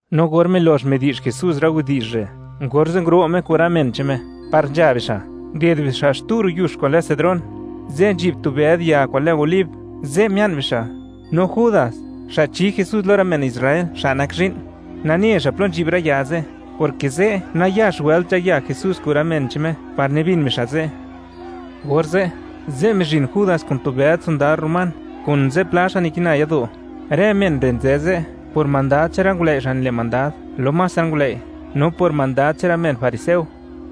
No or milox midi'zh Jesús rë widi'zh re', orze' nguro' Me kun rë men che'n Me par nzha bixa', nded bixa' xtu ro' yux kwa'n lë Cedrón. Ze' nzhi'b tu bëd ya kwa'n lë olib, ze' mia'n bixa'. No Judas, xa' chi Jesús lo rë men Israel xa' nak zhi'n, nane xa' plo nzhi'b rë ya ze', porke ze' nayax wëlt nzhaya Jesús kun rë men che'n Me par nibin bixa' ze'. Orze', ze' mizhin Judas kun tu bëd sondad román, kun zipla xa' nikina yado'; rë men re' nzë ze' por mandad che'n rë ngulëi' xa' nile' mandad lo más rë ngulëi', no por mandad che'n rë men fariseo.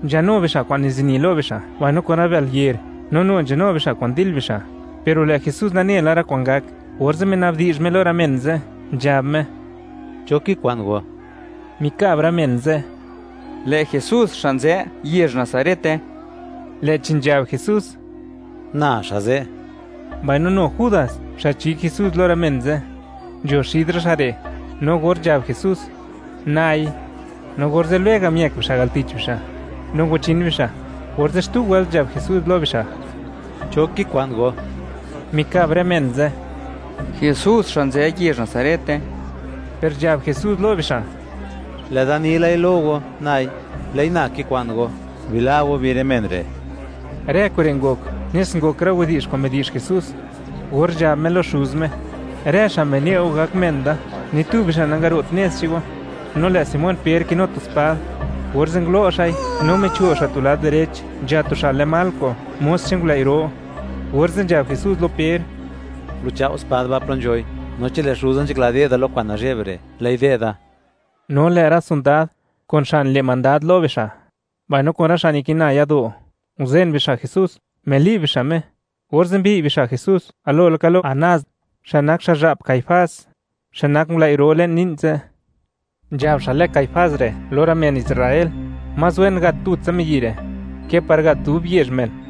Nzhanu bixa' kwa'n nizini lo bixa' mbaino kun rë bël yer, no nu nzhanu bixa' kwa'n dil bixa'. Per lë' Jesús nane la rë kwa'n gak, orze' mina'bdi'zh Me lo rë men ze', nzhab Me: ―¿Cho kikwa'n go? Mikab rë men ze': ―Lë' Jesús xa' nzë yezh Nazarete. Lë'chi nzhab Jesús: ―Na xa' ze'. Mbaino nu Judas xa' chi Jesús lo rë men ze', nzho xid rë xa' re', no or nzhab Jesús: “Nai”, no orze' lwega' miëk bixa' al tich bixa', no ngwachin bixa'. Orze' xtu wëlt nzhab Jesús lo bixa': ―¿Cho kikwa'n go? Mikab rë men ze': ―Jesús xa' nzë yezh Nazarete. Per nzhab Jesús lo bixa': ―Lë'da ni lai lo go, nai. Lë'i na kikwa'n go; bila' go bi rë men re'. Rë kure' ngok nes ngok rë widi'zh kwa'n midi'zh Jesús, or nzhab Me lo Xuz Me: “Rë xa' mine' Go gak men da, ni tu bixa' nangaro't nez che'n Go.” No lë' Simón Per kinu tu spad, orze' ngulo' xa'i, no micho' xa' tu lad direch nzha tu xa' lë Malco, mos che'n ngulëi' ro, orze' nzhab Jesús lo Per: —Guluchao' spad ba' plo nzhoi; no chi lë' Xuza nzhakla de'da lo kwa'n nazhe'b re', lë'i de'da. No lë' rë sondad, kun xa' nile' mandad lo bixa', mbaino kun rë xa' nikina yado', nguzen bixa' Jesús, mili'b bixa' Me, orze' mbi'y bixa' Jesús galo laka lo Anás, xa' nak xa'zha'p Caifás, xa' nak ngulëi' ro le'n li'n ze'. Nzhab xa' lë Caifás re' lo rë men Israel, más wen gat tutsa miyi' re' ke par gat dub yezh men.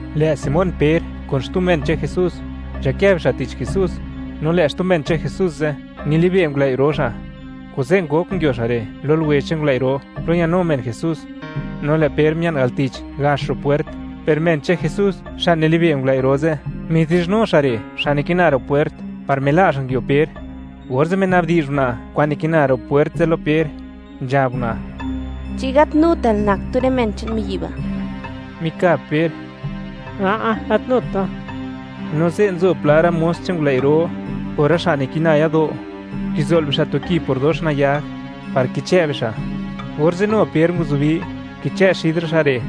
Lë' Simón Per kun xtu men che'n Jesús, nzhakë bixa' tich Jesús, no lë' xtu men che'n Jesús ze', nilibe' ngulëi' ro xa', kuze' ngok nguio xa' re' lo luwe che'n ngulëi' ro, plo ñanu men Jesús, no lë' Per mia'n al tich, gax ro' pwert; per men che'n Jesús xa' nilibe' ngulëi' ro ze', midi'zhnu xa' re' xa' nikina ro' pwert, par mila' xa' nguio Per. Orze' mina'bdi'zh una' kwa'n nikina ro' puert ze' lo Per, nzhab una': ―¿Chi gat nutal nak tu rë men che'n miyi' ba'? Mikab Per: ―A'a, gat nut da. No ze' nzo pla rë mos che'n ngulëi' ro kun rë xa' nikina yado', kizo'l bixa' tu ki por dox nayag, par kichë' bixa'; orze' nu Per nguzubi, kichë' xid rë xa' re'.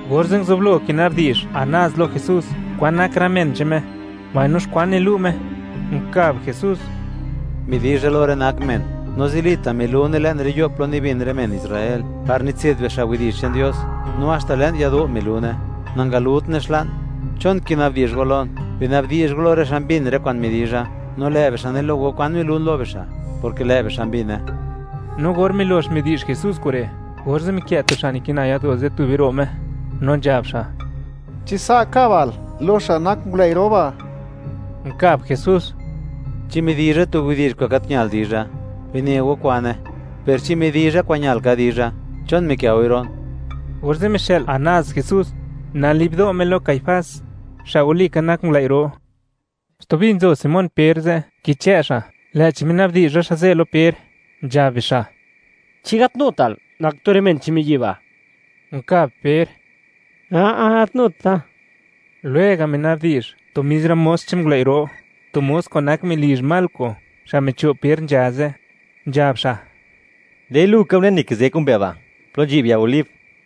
Orze' nguzublo kina'bdi'zh Anás lo Jesús, kwan nak rë men che'n Me, mbaino xkwan nilu' Me. Unkab Jesús: ―Midi'zha lo rë nak men, no zilita' milune le'n rë yo' plo nibin rë men Israel, par nitse'd bixa' widi'zh che'n Dios, no haxta le'n yado' milune; nangalutne xla'n. ¿Chon kinabdi'zh go lon? Bina'bdi'zh go lo rë xa' mbin rë kwa'n midizha, no lë' bixa' ne lo go kwan milun lo bixa', porke lë' bixa' mbine. No or milox midi'zh Jesús kure', orze' mikë' tu xa' nikina yado' ze' tube ro' Me, no nzhab xa': ―¿Chi sa' kabal lo xa' nak ngulëi' ro ba'? Unkab Jesús: ―Chi midizha tu widi'zh kwa'n gat ñal dizha, bine go kwane; per chi midizha kwa'n ñal ka dizha, ¿chon mikë' goi ro'n? Orze' mixë'l Anás Jesús nali'b do' Me lo Caifás, xa' mer ngulëi' ro. Stubi nzo Simón Per ze', kichë' xa', lë'chi mina'bdi'zh rë xa' ze' lo Per, nzhab bixa': ―¿Chi gat nutal nak tu rë men che'n miyi' ba'? Unkab Per: ―A'a, gat nut da. Lwega' mina'bdi'zh tu mis rë mos che'n ngulëi' ro, tu mos kwa'n nak melizh Malco, xa' micho' Per nzha ze', nzhab xa': ―¡Lë'i lu ka unen nikizë kun mbe ba', plo nzhi'b ya olib!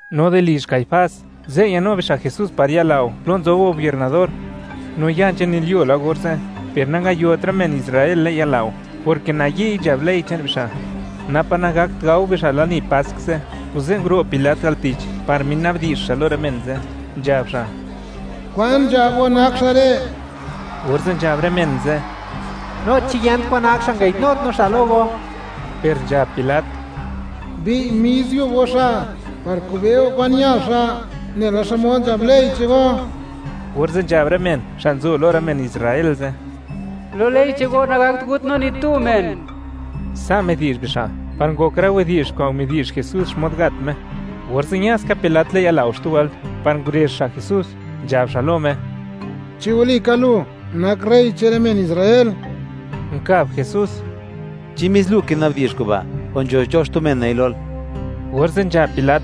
No di lizh Caifás, ze' ñanu bixa' Jesús par yalao plo nzob gobiernador, no ya nzhanilyuo la orze'; per nangayot rë men Israel le'n yalao, porke nayi'y nzhab ley che'n bixa', napa' nagakt gao bixa' lani Pask ze'. Kuze' nguro' Pilat al tich par mina'bdi'zh xa' lo rë men ze', nzhab xa': ―¿Kwan nzhab go nak xa' re'? Orze' nzhab rë men ze': ―No chi yent kwan nak xa', nangayi'dnut no xa' lo go. Per nzhab Pilat: ―Bi'y mis yub go xa', par kube' go kwan ñal xa', nela xmod nzhab ley che'n go. Orze' nzhab rë men xa' nzo lo rë men Israel ze': ―¡Lo ley che'n go, nagakt gut no ni tu men! Sa' midi'zh bixa' par ngok rë widi'zh kwa'n midi'zh Jesús xmod gat Me. Orze' ña ska Pilat le'n yalao xtu wëlt, par ngurezh xa' Jesús, nzhab xa' lo Me: ―¿Chi walika lu nak rey che'n rë men Israel? Unkab Jesús: ―¿Chi mis lu kina'bdi'zh kuba', o nzho cho xtu men nei lol? Orze' nzhab Pilat: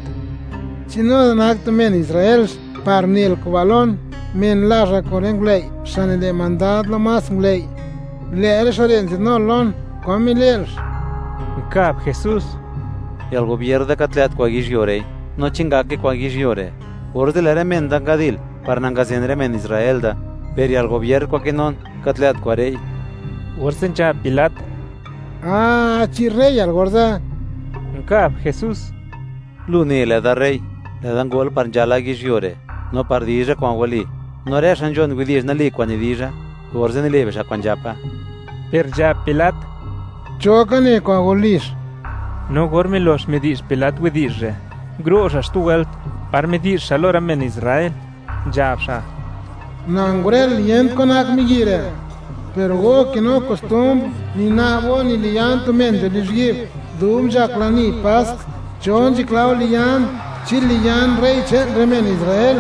―¿Chi nu da nak tu men Israelx par nel kuba' lon? Men lazhal kun rë ngulëi' xa' nile' mandad lo más ngulëi'; lë' rë xa' re' nzadnul lon. ¿Kwan mile'lx? Nkab Jesús: ―Yalgobier da gat lë't kwa'n yizhyuo re'i; no chi ngake kwa'n yizhyuo re', orze' lë' rë men da ngadil par nangazen rë men Israel da, per yalgobier kwa'n kinun, gat lë't kwa're'i. Orze' nzhab Pilat: ―Ah, ¿chi reyal orze'? Unkab Jesús: ―Lu ne, lë'da rey; lë'da ngol par nzhala yizhyuo re', no par dizha kwa'n wali. No rë xa' nzhon widi'zh wali kwa'n nidizha, orze' nile' bixa' kwa'n nzhapa. Per nzhab Pilat: ―¿Cho ka ne kwa'n walix? No or milox midi'zh Pilat widi'zh re', nguro' xa' xtu wëlt par midi'zh xa' lo rë men Israel, nzhab xa': ―Na ngurël, yent kwan nak miyi' re', per go kinu kostumbr, nina'b go, niliyan tu men nzho lizhyi'b, dub nzhak lani Pask. ¿Cho nzhakla go liyan? ¿Chi liyan rey che'n rë men Israel?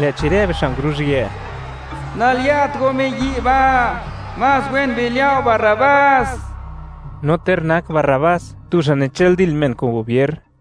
Lë'chi rë bixa' nguruzhië: ―¡Naliya't go miyi' ba'! ¡Más wen biliya' go Barrabás! No ter nak Barrabás tu xa' nichëldil men kun gubier.